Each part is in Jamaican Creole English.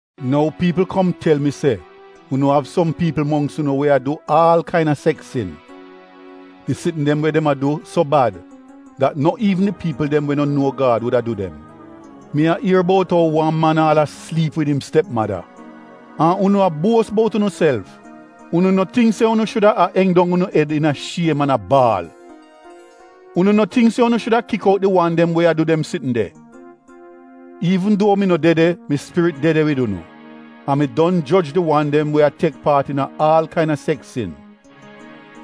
Nou piipl kom tel mi se unu av som piipl mongks unu we a du aal kaina seks sin. Di sitn dem we dem a du so bad dat no iivn di piipl dem we no nuo Gad wuda du dem. Mi a ier bout ou man aal a sliip wid im stepmada. An unu a buos bout unuself! Unu no tingk se unu shuda a eng dong unu ed iina shiem an a baal? Unu no tingk se unu shuda kik out di wan dem we a du dem sitn de? Iivn duo mi no de de, mi spirit de de wid unu. An mi don joj di wan dem we a tek paat iina aal kaina seks sin.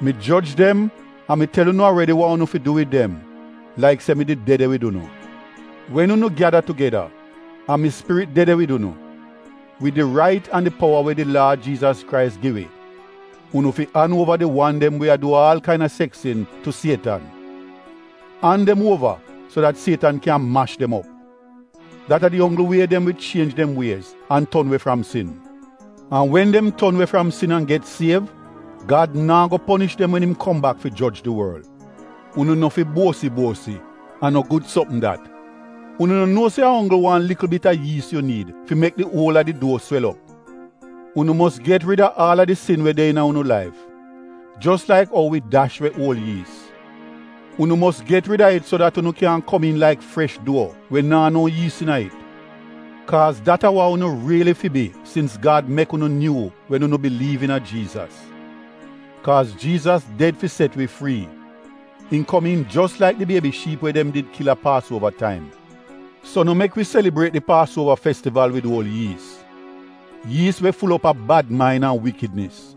Mi joj dem an mi tel unu aredi wa unu fi du wid dem, laik se mi did de de wid unu. Wen unu gyada tugeda an mi spirit de de wid unu, wid di rait an di powa we di Laad Jiizas Krais gi wi, unu fi an uova di wan dem we a du aal kaina seks sin tu sietan. An dem uova so dat sietan kyan mash dem op. Dat a di onggl wie dem wi chienj dem wiez an ton we fram sin. An wen dem ton we fram sin an get siev, Gad naa go ponish dem wen im kom bak fi joj di worl. Unu no fi buosi-buosi a no gud sopm dat! Unu no nuo se a onggl wan likl bit a yiis yu niid fi mek di uol a di duo swel op? Unu mos get rida aal a di sin we de iina unu laif, jos laik ou wi dash we uol yiis. Unu mos get rida it so dat unu kyan komiin laik fresh duo we naa no yiis iina it. Kaaz dat a wa unu riili fi bi sins Gad mek unu nyuu wen unu biliiv iina Jiizas. Kaaz Jiizas ded fi set wi frii, im komiin jos laik di biebi shiip we dem did kil a paasuova taim. So no mek wi selibriet di paasuova festival wid uol yiis — yiis we ful op a bad main an wikidnis.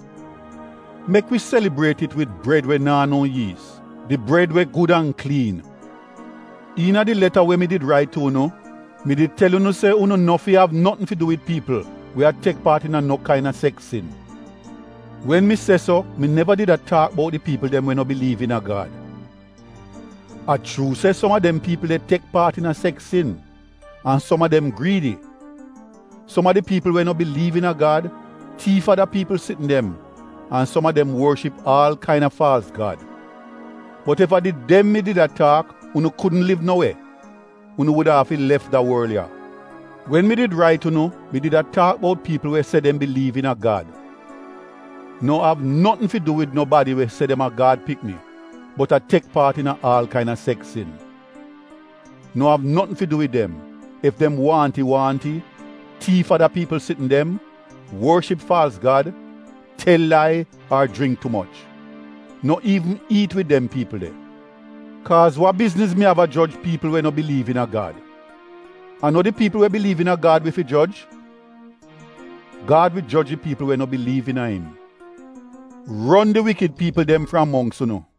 Mek wi selibriet it wid bred we naa no yiis — di bred we gud an kliin. Iina di leta we mi did rait tu unu, mi did tel unu se unu no fi av notn fi du wid piipl we a tek paat iina no kaina seks sin. Wen mi se so mi neva did a taak bout di piipl dem we no biliiv iina Gad. A chuu se som a dem piipl de tek paat iina seks sin an som a dem griidi. Som a di piipl we no biliiv iina Gad, tiif ada piipl sitn dem an som a dem worship aal kaina faalz gad. Bot ef a did dem mi did a taak unu kudn liv no we — unu wuda afi lef da worl ya. Wen mi did rait unu mi did a taak bout piipl we se dem biliiv iina Gad. No av notn fi du wid nobadi we se dem a Gad pikni bot a tek paat iina aal kaina seks sin. No av notn fi du wid dem ef dem waahnti-waahnti, tiif ada piipl sitn dem, worship faalz gad, tel lai ar jringk tu moch. No iivn iit wid dem piipl de. Kaaz wa bizniz mi av a joj piipl we no biliiv iina Gad? A no di piipl we biliiv iina Gad wi fi joj? Gad wi joj di piipl we no biliiv iina im. “Ron di wikid piipl dem fram mongks unu.”